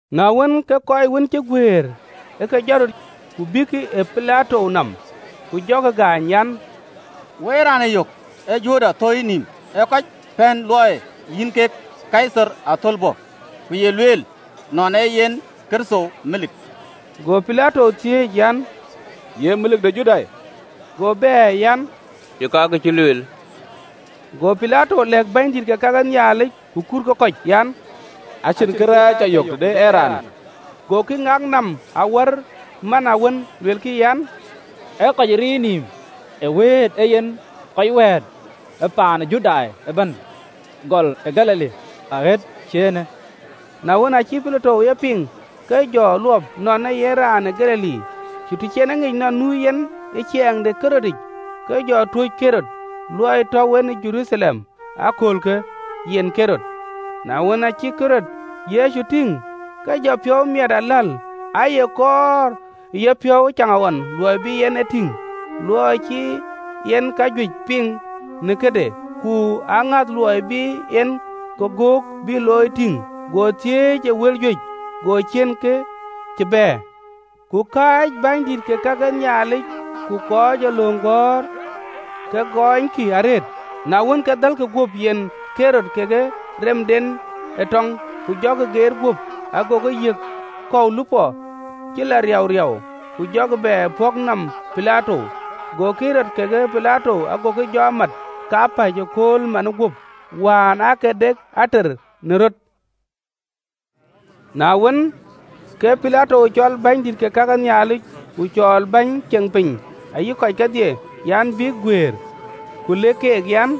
Na wën, ke kɔc wën cï guëër ë ke jɔt röt, ku bïïkï ë Pilato nɔm. Ku jɔkï gaany an, “Wo ë raanë yök, ee jurda thöi nɔm, ee kɔc pɛ̈n luɔi yïn kek Kaithar athölbö, ku ye lueel nɔn ee yen Kërtho melik.” Go Pilato thiëëc an, “Ye melik de Judai?” Go bɛ̈ɛ̈r an, “Yeka, kë cï lueelë.” Go Pilato lɛ̈k bänydït ke ka ke Nhialic ku kuut ke kɔc an, “Acïn awäny cä yök tëde ëraanë.” Gokï ŋak nɔm awär man awën, luelkï an, “Ee kɔc riir nïïm, ë wëët ee yen kɔc wɛ̈ɛ̈t ë paan ë Judai ëbɛ̈n, gɔl ë Galili, aɣet cï eenë.” Na wën, aacï Pilato ye piŋ, ke jɔ luɔp nɔn ee yen raan ë Galili. Ku të cï en e ŋic nɔn nu yen ë ciɛɛŋ de Ɣerodic, ke jɔ tuöc Ɣerod, luɔi tɔ̈u en ë Jeruthalem ee aköölkë yen Ɣerod. Na wën, aacï Ɣerod Yecu tïŋ, ke jɔ piɔ̈u miɛt aläl, aaye kɔɔr ë yepiɔ̈u ëcaŋɣɔn luɔi bï en e tïŋ, luɔi cï en kajuëc piŋ në këde, ku aŋäth luɔi bï en këgök bï looi tïŋ. Go thiëëc ë wël juëc, go ciën kë cï bɛ̈ɛ̈r. Ku kääc bänydït ke ka ke Nhialic ku kɔc ee löŋ gɔ̈ɔ̈r, ke gɔɔnykï arëët. Na wën, ke dhälkï guöp, yen Ɣerod kekë remdɛn ë tɔŋ, ku jɔkï geet guöp, agokï yiɛ̈n kɔ̈u lupɔ cï lɔ riauriau, ku jɔkï bɛ pɔ̈k nɔm Pilato. Go Ɣerod kekë Pilato gokï jɔ mat kapäc ëkööl manë guöp: wään aake de ater në röt. Na wën, ke Pilato cɔl bänydït ke ka ke Nhialic, ku cɔɔl bäny ceŋ piny ayï kɔc kedhie an, bïk guëër, ku lëk keek an,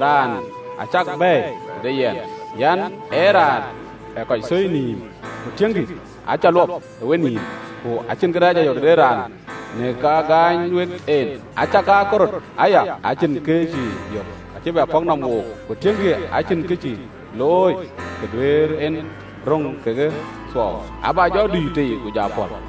“Raanë acäk bɛ̈ɛ̈i tëde yɛn an, ee raan ë kɔc thöi nïïm: ku tiëŋkï, acä luɔp ë wenïïm, ku acïn kërɛɛc cä yök tëde raanë në ka gaany wek en. Acakaa Ɣerod aya, acïn kë cï yök, acï bɛ pɔ̈k nɔm wook, ku tiëŋkï, acïn kë cï looi kë duëër en röŋ ke thuɔɔu. Abä jɔ dui tei, ku ja pɔ̈l.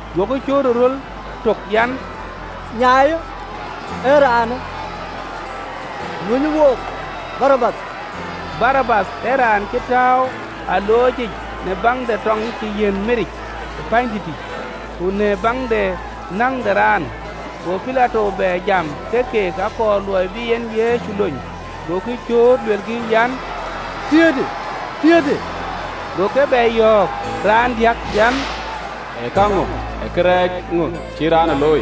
Gokï cööt ë röl tök an, “Nyaaiyë raanë, ku luönyë wook Barabath.” (Barabath ee raan cï tääu ë alooc yic në baŋ de tɔŋ cï yiɛ̈n miric ë pänydïtë, ku në baŋ de näŋ de raan.) Go Pilato bɛ jam ke keek, akɔɔr luɔi bï en Yecu lony. Gokï cööt luelkï an, “Piäätë, piäätë!” Go keek bɛ yɔ̈ɔ̈k raandiäk an, “Ee käŋö, ee kërɛɛc ŋö cï raanë looi?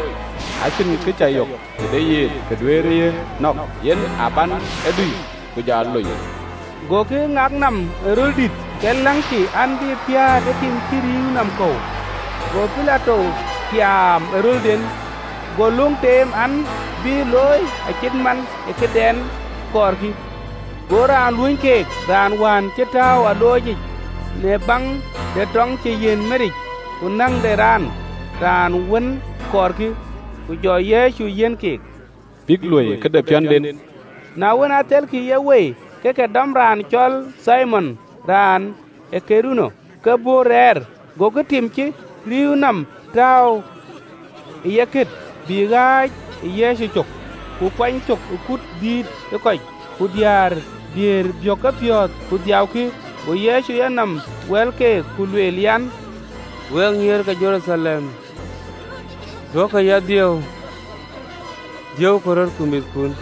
Acïn awäny cä yök tëde yen kë duëër ye nɔ̈k: yen a bän e dui ku jɔ lony.” Gokï ŋak nɔm ë röl dït, ke läŋkï an, bï piäät ë tim cï rïïu nɔm kɔ̈u. Go Pilato tiaam ë rölden. Go löŋ teem an, bï looi acït man ë këdɛn kɔɔrkï. Go raan luöny keek, raan wään cï tääu ë alooc yic në baŋ de tɔŋ cï yiɛ̈n miric ku näŋ de raan, raan wën kɔɔrkï, ku jɔ Yecu yiɛ̈n keek, bïk luöi këde piɔ̈nden. Na wën, athelkï ye wei, ke ke dɔm raan cɔl Thimon raan ë Kurene, ke bɔ̈ rɛɛr, gokï tim cï rïïu nɔm tääu ë yekët, bï ɣääc ë Yecu cök. Ku kuany cök ë kut dïït ë kɔc, ku diäär, diëër biëk kepiɔ̈ɔ̈th ku dhiëëukï. Go Yecu yenɔm wɛ̈l keek, ku lueel an, “Wek nyïïr ke Jeruthalem, duökï ya dhiëëu, dhiëëukï röt, ku mïthkun.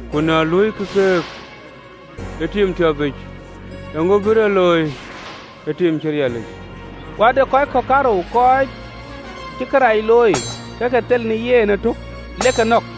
Ku na loikï kake ë tim tiɔpic, eeŋö bïk looi në tim cï riɛlic?” Ku ade kɔc kɔ̈k kaarou, kɔc cï kërac looi, go ke thel në yen ëtök le ke nɔ̈k.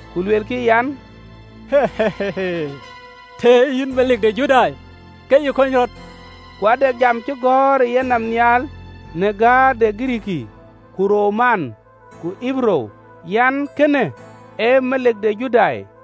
ku luelkï an, “Tën ee yïn Melik de Judai, ke yï kony rɔt!” Ku ade jam cï gɔ̈ɔ̈r ë yenɔm nhial, në gäär de Girikii ku Roma ku Ɣeberuu an, “Kënë ee Melik de Judai.”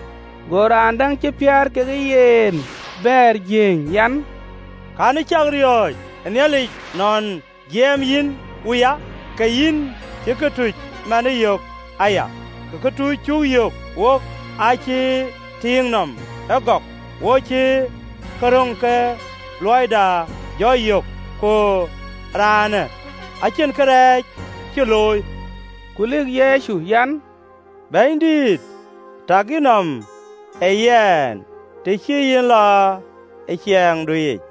Go raan däŋ cï piäät kekë yen bɛ̈ɛ̈r, jiëëny an, “Cï ye cak riɔ̈ɔ̈c ë Nhialic, nɔn jiɛɛm yïn wuya, ke yïn cï këtuc manë yök aya? Ku këtuc cuk yök wook acï tiiŋ nɔm ëgɔk, wo cï kë röŋ ke luɔida jɔ yök: ku raanë acïn kërɛɛc cï looi.” Ku lëk Yecu an, “Bɛ̈nydït, tak yïnɔm ë yɛn, të cï yïn lɔ ë ciɛɛŋdu yic!”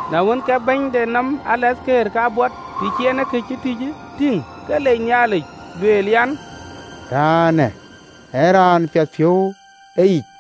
Na wën, ke bɛ̈ny de tɔŋ kabɔt, të cï en kë cï tïc tïŋ, ke lec Nhialic, lueel an, “Raanë ee raan piɛthpiɔ̈u ë yic!”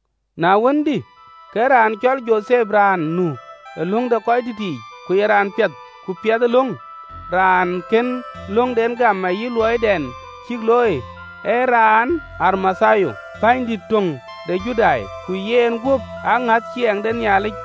Na wën, dï, ke raan cɔl Jothep, raan nu ë löŋ de röördït yiic, ku ye raan piɛth ku piɛth ë löŋ, (raan kën löŋden gam ayï luɔidɛn cïk looi), ee raan ë Arimathia, pänydïït töŋ de Judai, ku yenguöp aŋäth ciɛɛŋ de Nhialic: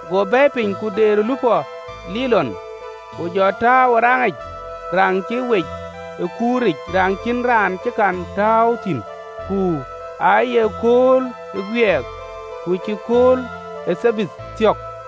Go bɛ̈ɛ̈i piny, ku deer ë lupɔ linɔn, ku jɔ tääu ë raŋic, raŋ cï wec ë kuur lɔ giliu yic, raŋ cïn raan cï kɔn tɔ̈ɔ̈u thïn. Ku aaye kööl ë guiɛɛk, ku cï kööl ë Thabath thiɔ̈k.